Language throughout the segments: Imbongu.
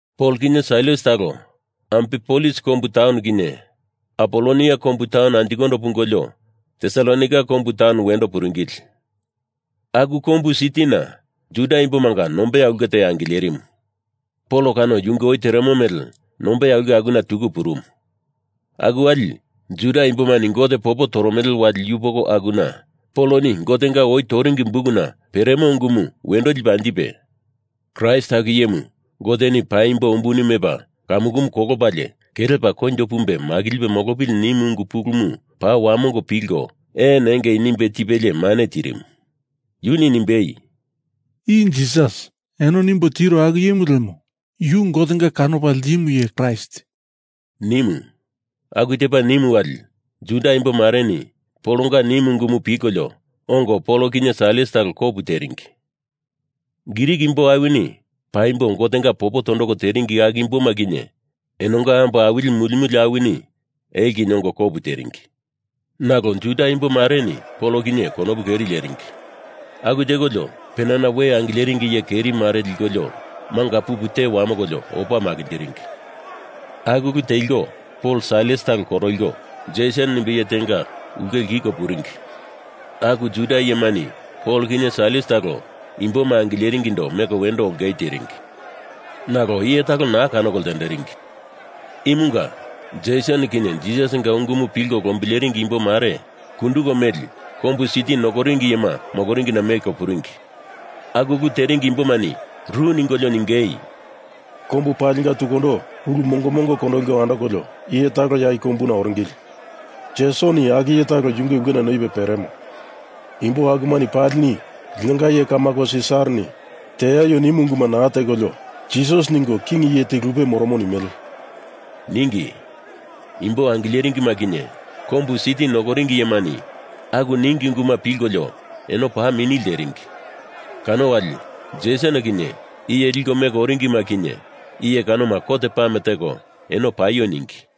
Pol kinye Sailas talo Amfipolis kombu taun kinye Apolonia kombu taun anjikondo pungolio Tesalonaika kombu taun wendo puringili. Aku kombu sitina Juda imbomanga nombeya ulke te angilerimu. Pol kano yunge oi teremo mele nombeya ulke kanona tuku purumu. Aku wali Juda imbomani Gote popo toromele wali yupoko akuna Poloni Gotenga oi toringi bukuna peremo ungumu wendo lipe anjipe Kraist aku iyemu Goteni paimbo umbuni mepa kamukumu kolopalie kelepa koinjo pumbe makilipe molopili nimu ungu pulumu paa wamongo pilko ee nengei nimbe tipelie mane tirimu. Yuni nimbei, “I Jisas eno nimbo tiro aku iyemu lemo, yu Gotenga kanopa ltimu iye Kraist,” nimu. Aku tepa nimu wali Juda imbo mareni Polonga nimu ungumu pilkolio ongo Pol kinye Sailas talo kopu teringi. Grik imbo awini paimbo Gotenga popo tondoko teringi aku imboma kinye enonga ambo awili muli muli awini elo kinye ongo kopu teringi. Nalo Juda imbomareni Pol kinye konopu keri leringi. Aku tekolio penana we angileringi iye keri mare likolio manga pupu te wamokolio opa makinjiringi. Aku ulu teliko Pol Sailas talo koroliko Jeson nimbe iye tenga ulke lkiko puringi. Aku Juda iyemani Pol kinye Sailas talo imboma angileringindo meko wendo ongei teringi. Nalo iye talo naa kanoko ltenderingi. Imunga Jeson kinye Jisasinga ungumu pilko lombileringi imbo mare kunduko meli kombu siti nokoringi iyema moloringina meko puringi. Aku ulu teringi imbomani ru ningolio ningei, “Kombu palinga tukundo ulu mongo mongo kondoliko andokolio iye talo ya i kombuna kape oringili. Jesoni aku iye talo yunge ulkena noipe peremo. Imbo akumani palini linonga iye kamako Sisarani teaio nimu unguma naa tekolio, Jisas ningo king iye te lupe moromo nimele,” ningi. Imbo angileringima kinye kombu siti nokoringi iyemani aku ningi unguma pilkolio eno paa mini lteringi. Kano wali Jeson kinye iye liko meko oringima kinye iye kanoma kot pame teko eno paio ningi.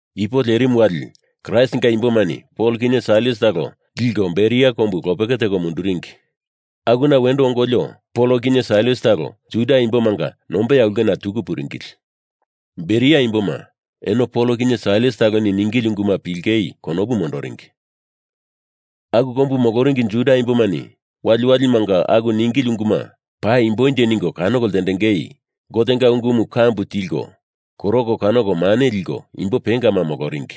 Ipu lerimu wali Kraistinga imbomani Pol kinye Sailas talo liko Beria kombu lopeke teko munduringi. Akuna wendo ongolio Pol kinye Sailas talo Juda imbomanga nombeya ulkena tuku puringili. Beria imboma, eno Pol kinye Sailas taloni ningili unguma pilingei konopu mondoringi. Aku kombu moloringi Juda imbomani waliwalimanga aku ningili unguma paimbonje ningo kanoko ltendengei Gotenga ungumu kambu tiltiko koroko kanoko mane liko, imbo pengama moloringi.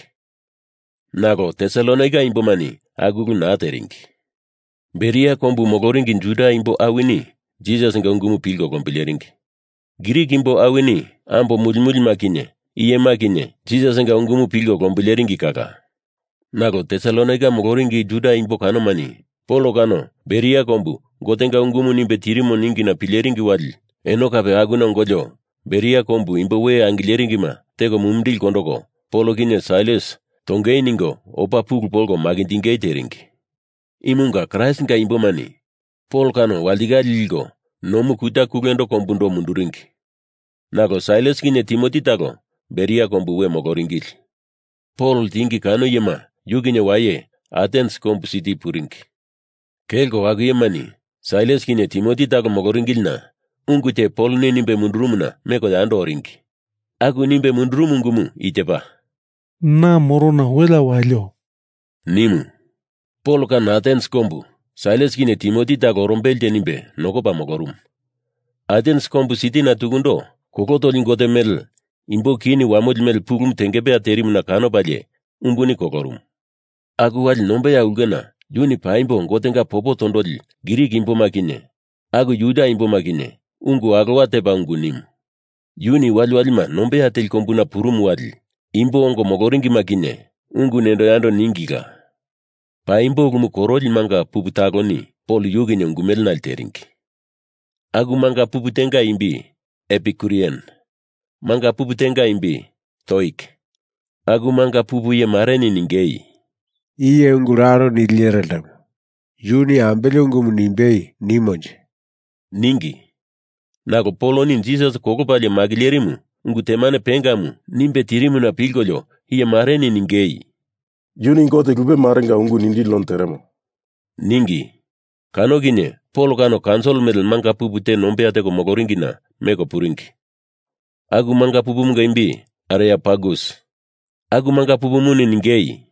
Nalo Tesalonaika imbomani aku ulu naa teringi. Beria kombu moloringi Juda imbo awini Jisasinga ungumu pilko lombileringi. Grik imbo awini, ambo muli mulima kinye iyema kinye Jisasinga ungumu pilko lombileringi kala. Nalo Tesalonaika moloringi Juda imbo kanomani Pol kano Beria kombu Gotenga ungumu nimbe tirimo ningina pileringi wali eno kape akuna ongolio Beria kombu imbo we angileringima teko mumindili kondoko Pol kinye Sailas tongei ningo opa pulu polko makinjingei teringi. Imunga Kraistinga imbomani Pol kano walitikale liko nomu kuta kulendo kombundo munduringi. Nalo Sailas kinye Timoti talo Beria kombu we moloringili. Pol ltingi kano iyema yu kinye waye Atens kombu siti puringi. Kelko aku iyemani Sailas kinye Timoti talo moloringilina ungu te Poloni nimbe mundurumuna meko yando oringi. Aku nimbe mundurumu ungumu i tepa, “Na morona welea walio,” nimu. Pol kano Atens kombu Sailas kinye Timoti talo orombelenje nimbe nokopa molorumu. Atens kombu sitina tukundo kolo toli gote mele imbo kini wamoli mele pulumu tengepeya terimuna kanopalie umbuni kolorumu. Aku wali nombeya ulkena yuni paimbo Gotenga popo tondoli Grik imboma kinye aku Juda imboma kinye ungu alowa tepa ungu nimu. Yuni waliwalima nombeya teli kombuna purumu wali, imbo ongo moloringima kinye ungu nendo yando ningila. Paimbo ulumu koroli manga pupu taloni Pol yu kinye ungu mele nale teringi. Aku manga pupu tenga imbi Epikurian. Manga pupu tenga imbi Stoik. Aku manga pupumunga iye mareni ningei, “Iye ungu lalo nili iyere ltemo. Yuni ambele ungumu nimbei nimonje,” ningi. Nalo Poloni Jisas kolopalie makilerimu ungu temane pengamu nimbe tirimuna pilkolio iye mareni ningei, “Yuni gote lupe marenga ungu nindili none teremo,” ningi. Kano kinye Pol kano kaunsil mele manga pupu te nombeya teko moloringina meko puringi. Aku manga pupumunga imbi Areopagus. Aku manga pupumuni ningei,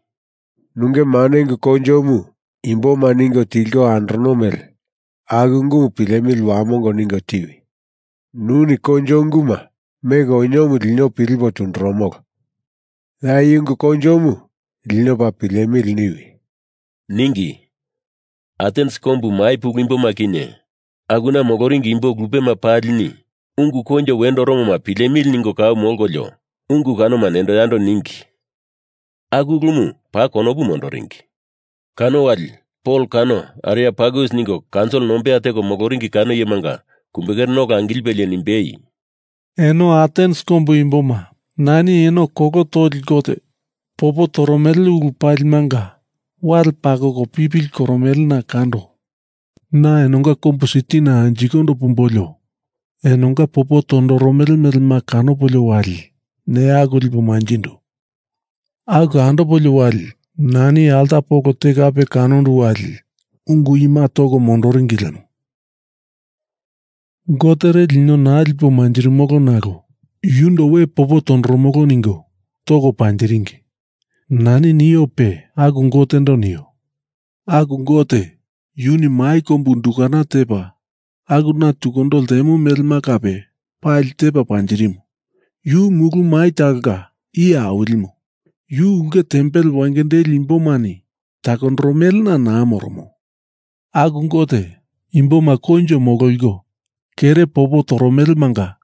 “Nunge mane ungu koinjomu imboma ningo tilko andorono mele aku ungumu pilemili wamongo ningo tiwi. Nuni koinjo unguma meko oniomu lino pilipo tundurumolo. Ya i ungu koinjomu lino paa pilemili niwi,” ningi. (Atens kombu mai pulu imboma kinye akuna moloringi imbo lupema palini ungu koinjo wendo oromoma pilemili ningo kau molkolio ungu kanoma nendo yando ningi. Aku ulumu paa konopu mondoringi.) Kano wali Pol kano Areopagus ningo kaunsil nombeya teko moloringi kano iyemanga kumbekerena ola angilipelie nimbei, “Eno Atens kombu imboma, nani eno kolo toli gote popo toromele ulu palimanga wale pakoko pipili koromelena kando. Na enonga kombu sitina anjikondo pumbolio enonga popo tondoromele melema kanopolio wali neya aku lipo manjindu. Aku andopolio wali nani alta polo te kape kanondu wali ungu ima toko mondoringi lemo ‘gotere lino naa lipo manjirimolo nalo yundo we popo tondoromolo’ ningo toko panjiringi. Nani niope aku Gotendo nio. Aku Gote yuni mai kombu undukana tepa, akuna tukundo ltemo melema kape pali tepa panjirimu. Yu mulu mai talonga Iye Awilimu. Yu ulke tempel wengendeli imboni takoromelemanga naa moromo. Aku Gote, imboma koinjo mololiko kere popo toromelemanga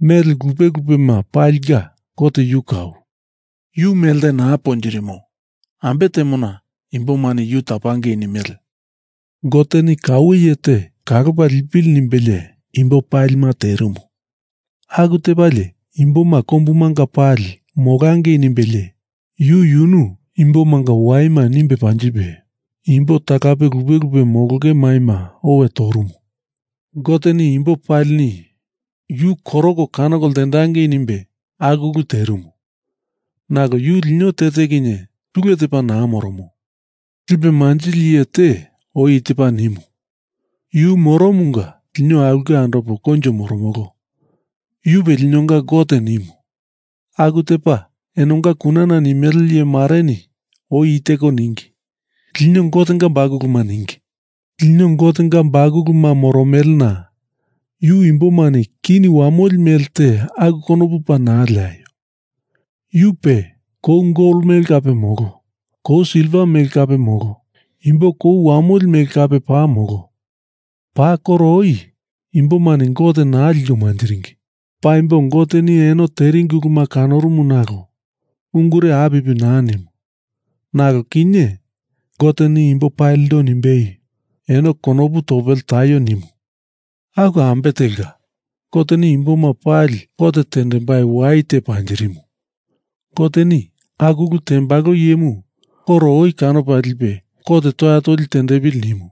mele lupe lupema palinga Gote yu kau. Yu melte naa ponjirimo, ambe temona imbomani yu tapangei nimele. Goteni kaue iye te kalopa lipili nimbelie imbo palima terimu. Aku tepalie imboma kombumanga pali molangei nimbelie, yu yunu imbomanga waima nimbe panjipe imbo talape lupe lupe molonge maima owe torumu. Goteni imbo palini yu koroko kanoko ltendangei nimbe aku ulu terimu. Nalo yu lino te te kinye tule tepa naa moromo. Lipe manjili iye te oi i tepa nimu: ‘Yu moromomunga lino aulke andopo koinjo moromolo. Yupe linonga Gote,’ nimu. Aku tepa enonga kunana nimele iye mareni oi i teko ningi, ‘Lino Gotenga bakuluma,’ ningi. Lino Gotenga bakuluma moromelena yu imbomani kini wamoli mele te aku konopu paa naa leaio. Yu pe kou gol mele kape molo. Kou silva mele kape molo. Imbo kou wamoli mele kape paa molo. Paa koro oi imbomani Gote naa liko manjiringi. Paimbo Goteni eno teringi uluma kanorumu nalo ungure apipi naa nimu. Nalo kinye Goteni imbo palindo nimbei, eno konopu topele taio nimu. Aku ambe telka, Goteni imboma pali kot tendembai wai te panjirimu. Goteni aku ulu tembalo iyemu koro oi kanopa lipe kot toya toli tendepili nimu.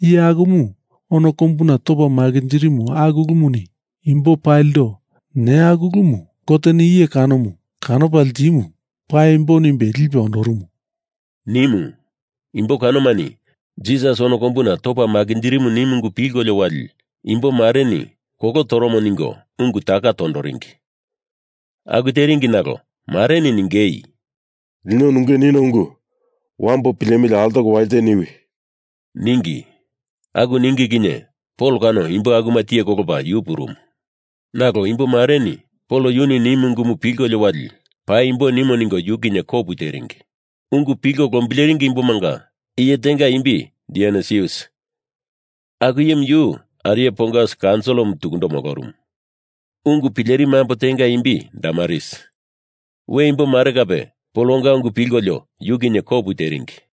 Iye akumu ono kombuna topa makinjirimu aku ulumuni imbo palindo neya aku ulumu Goteni iye kanomu kanopa ltimu paimbo nimbe lipe ondorumu,” nimu. Imbo kanomani Jisas ono kombuna topa makinjirimu nimu ungu pilkolio wali imbo mareni kolo toromo ningo ungu taka tondoringi. Aku teringi nalo mareni ningei, “Lino nunge nino ungu wambo pilemili altoko walite niwi,” ningi. Aku ningi kinye Pol kano imbo akuma tiye kolopa yu purumu. Nalo imbo mareni Pol yuni nimu ungumu pilkolio wali paimbo nimo ningo yu kinye kopu teringi. Ungu pilko lombileringi imbomanga iye tenga imbi Dionisius, aku iyemu yu Areopagus kaunsilimu tukundo molorumu. Ungu pilerimu ambo tenga imbi Damaris. We imbo mare kape Polonga ungu pilkolio yu kinye kopu teringi.